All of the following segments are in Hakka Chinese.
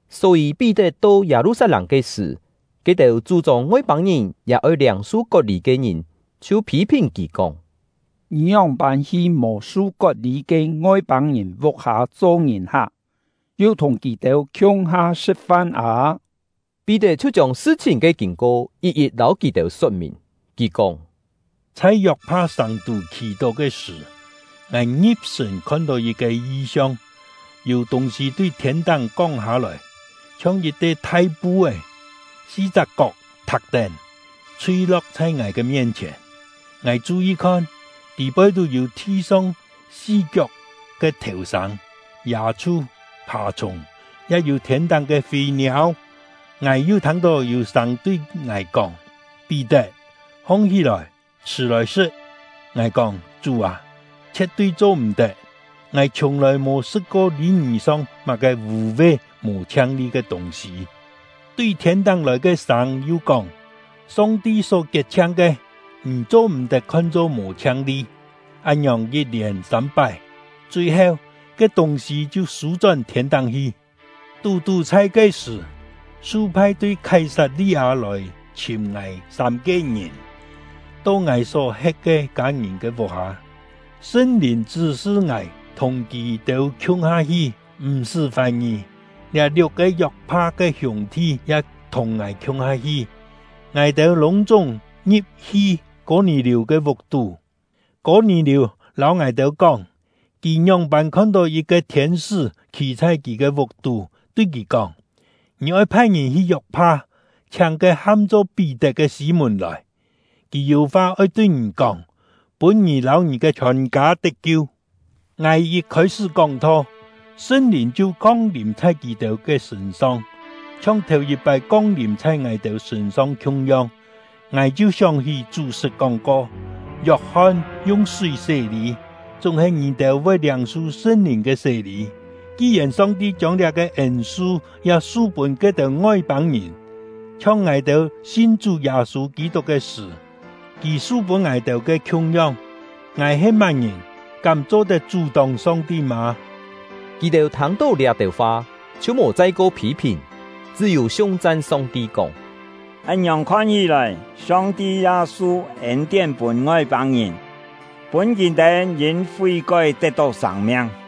Só-yî, Pí-tet to Yâ-lu-sat-lâng ke sṳ̀, ke-têu chú-chông Ngoi-pâng-ngìn ya oi liâng-su kot-lî ke ngìn chhiu phî-phìn kì kóng: “Ngì ngióng-pân hi mò su kot-lî ke Ngoi-pâng-ngìn vuk-hâ cho ngìn-hak, yu thùng kì-têu khiung-ha sṳ̍t-fan â!” Pí-tet chhiu chiông sṳ-chhìn ke kîn-ko yit-yit lâu kì-têu sot-mìn. Kì kóng: “Chhai Yok-pha sàng-tú khì-tó ke sṳ̀, ngài ngi̍p-sṳ̀n khon-tó yit-ke yi-siong. Yû tûng-sî tui thiên-táng kong hâ-lòi, chhiong yit-te thai pu-é, si-chak kok thak-tén, chhui-lo̍k chhai ngài ke mien-chhièn. Ngài chu-yi khon, tî-poi yû thi-song si-kiok ke thèu-sâng, yâ-chhu, phà-chhùng, ya yû thiên-táng ke fî-niâu. Ngài yu thâng-tó yû sâng tui ngài kóng: ‘Pí-tet, hong-hí-lòi, chhṳ̀ lòi sṳ̍t!’ Ngài kóng: ‘Chú â, chhie̍t-tui cho-m̀-tet! Ngài chhiùng-lòi mò sṳ̍t-ko lî-ngì song má-ke vû-ve mò chhiang-li ke tûng-sî.’ Tui thiên-táng lòi ke sâng yu kóng: ‘Song-ti só kiet-chhiang ke, ngì cho-m̀-tet khon-cho mò chhiang-li.’ Án-ngiòng yit-lièn sâm-pái; chui-heu, ke tûng-sî chhiu sû-chón thiên-táng hi. Tú-tú chhai ke-sṳ̀, su phai tui Khái-sat-li-â lòi chhìm ngài ke sâm-ke ngìn, to ngài só-he̍t ke kâ-ngìn ke vuk-hâ. Sṳn-Lìn chṳ́-sṳ ngài thùng kì-têu khiung-ha hi, m̀-sṳ́ fài-ngì. Liá liuk-ke Yok-pha ke hiûng-thi ya thùng ngài khiung-ha hi; ngài-têu lûng-chúng ngi̍p-hi Kô-nì-liù ke vuk-tú. Kô-nì-liù lâu ngài-têu kóng, kì ngióng-pân khon-tó yit-ke thiên-sṳ́ khî chhai kì ke vuk-tú, tui kì kóng: ‘Ngì oi phai ngìn hi Yok-pha, chhiáng ke ham-cho Pí-tet ke Sî-mùn lòi. Kì yû fa oi tui ngì kóng, pûn ngì lâu ngì ke chhiòn-kâ tet-kiu.’ Ngài yit khôi-sṳ́ kóng-tho, Sṳn-Lìn chhiu kong-lìm chhai kì-têu ke sṳ̂n-song, chhiong thèu-yit-pái kong-lìm chhai ngài-têu sṳ̂n-song khiung-yong. Ngài chhiu sióng-hí Chú sṳt kóng-ko: ‘Yok-hon yung súi hàng sé-lî, chúng-he ngì-têu voi liâng-su Sṳn-Lìn ke sé-lî.’ Ki-yèn Song-ti chiông liá-ke ên-su ya su-pûn ke-têu Ngoi-pâng-ngìn, chhiong ngài-têu sin Chú Yâ-sû Kî-tuk ke sṳ̀ Kì su-pûn ngài-têu ke khiung-yong; ngài he má-ngìn, kám cho-tet chú-tóng Song-ti mâ?” Kì-têu thâng-tó liá-têu fa, chhiu mò chai-ko phî-phìn, chṳ́-yû siung-chan Song-ti kóng: “Án-ngiòng khon hí-lòi, Song-ti ya su ên-tién pûn Ngoi-pâng-ngìn, pûn kì-têu yîn fí-kói tet-tó sâng-miang!”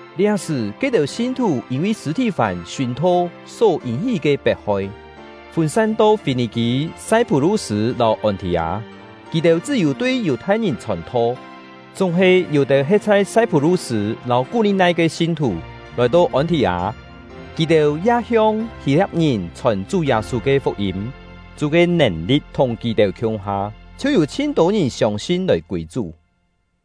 Liá-sṳ̀, ke-têu sin-thù yîn-vi Sṳ̂-thì-fán sùn-tho só yîn-hí ke pet-hoi, fûn-san to Fî-nì-kî, Sai-phú-lu-sṳ̂, lâu Ôn-thì-â; kì-têu chṳ́-yû tui Yù-thai-ngìn chhòn-tho. Chúng-he, yû-têu he̍t chhai Sai-phú-lu-sṳ̂ lâu Kú-li-nai ke sin-thù lòi-to Ôn-thì-â; kì-têu ya hiong Hî-lia̍p-ngìn chhòn Chú Yâ-sû ke fuk-yîm. Chú ke nèn-li̍t thùng kì-têu khiung-ha, chhiu yû chhin-tô ngìn siông-sin lòi kûi Chú.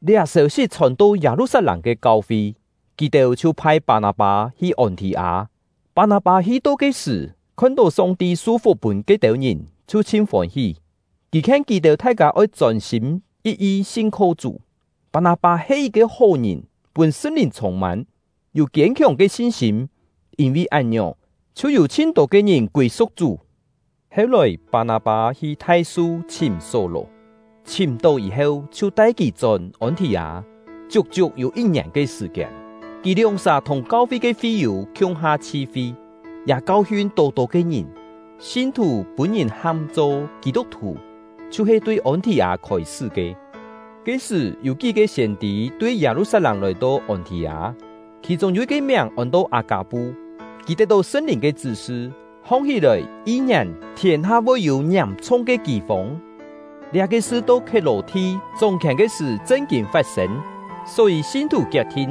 Liá sêu-sit chhòn-to Yâ-lu-sat-lâng ke kau-fi, kì-têu chhiu phai Pâ-nâ-pâ hi Ôn-thì-â. Pâ-nâ-pâ hi-to ke sṳ̀, khon-tó Song-ti su-fuk pûn ke-têu ngìn, chhiu chhin fôn-hí; kì khien kì-têu thai-kâ oi chôn-sîm yit-yi sin-kho Chú. Pâ-nâ-pâ he yit-ke hó ngìn, pûn Sṳn-Lìn chhûng-mân, yû kiên-khiòng ke sin-sîm. Yîn-vi án-ngiòng, chhiu yû chhin-tô ke ngìn kûi-su̍k Chú. Heu-lòi, Pâ-nâ-pâ hi Thai-su chhìm Só-lò; chhìm-tó yî-heu, chhiu tai kì chón Ôn-thì-â. Chiuk-chiuk yû yit-ngièn ke sṳ̀-kiên, kì lióng-sà thùng kau-fi ke fi-yû khiung-ha chhi-fi, ya kau-hiun tô-tô ke ngìn. Sin-thù pûn-ngìn ham-cho “Kî-tuk-thù” chhiu-he tui Ôn-thì-â khôi-sṳ́ ke. Ke-sṳ̀, yû kí-ke siên-tî tui Yâ-lu-sat-lâng lòi-to Ôn-thì-â. Khì-chûng yû yit-ke miàng ôn-to Â-kâ-pu; kì tet-tó Sṳn-Lìn ke chṳ́-sṳ, hong-hí-lòi yi-ngièn thiên-ha voi yû ngiàm-chhung ke kî-fông. (Liá-ke sṳ to Khiet-lò-thi chóng-khièn ke sṳ̀ chṳn-kîn fat-sên.) Só-yî sin-thù kiet-thin,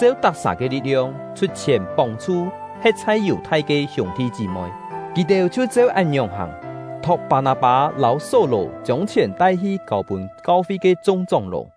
cheu tak-sà ke li̍t-liong, chhut chhièn pông-chhu he̍t chhai Yù-thai ke hiûng-thi chí-moi. Kì-têu chhiu cheu án-ngiòng hàng, thok Pâ-nâ-pâ lâu Só-lò chiông chhièn tai-hi kâu-pûn kau-fi ke chung chóng-ló.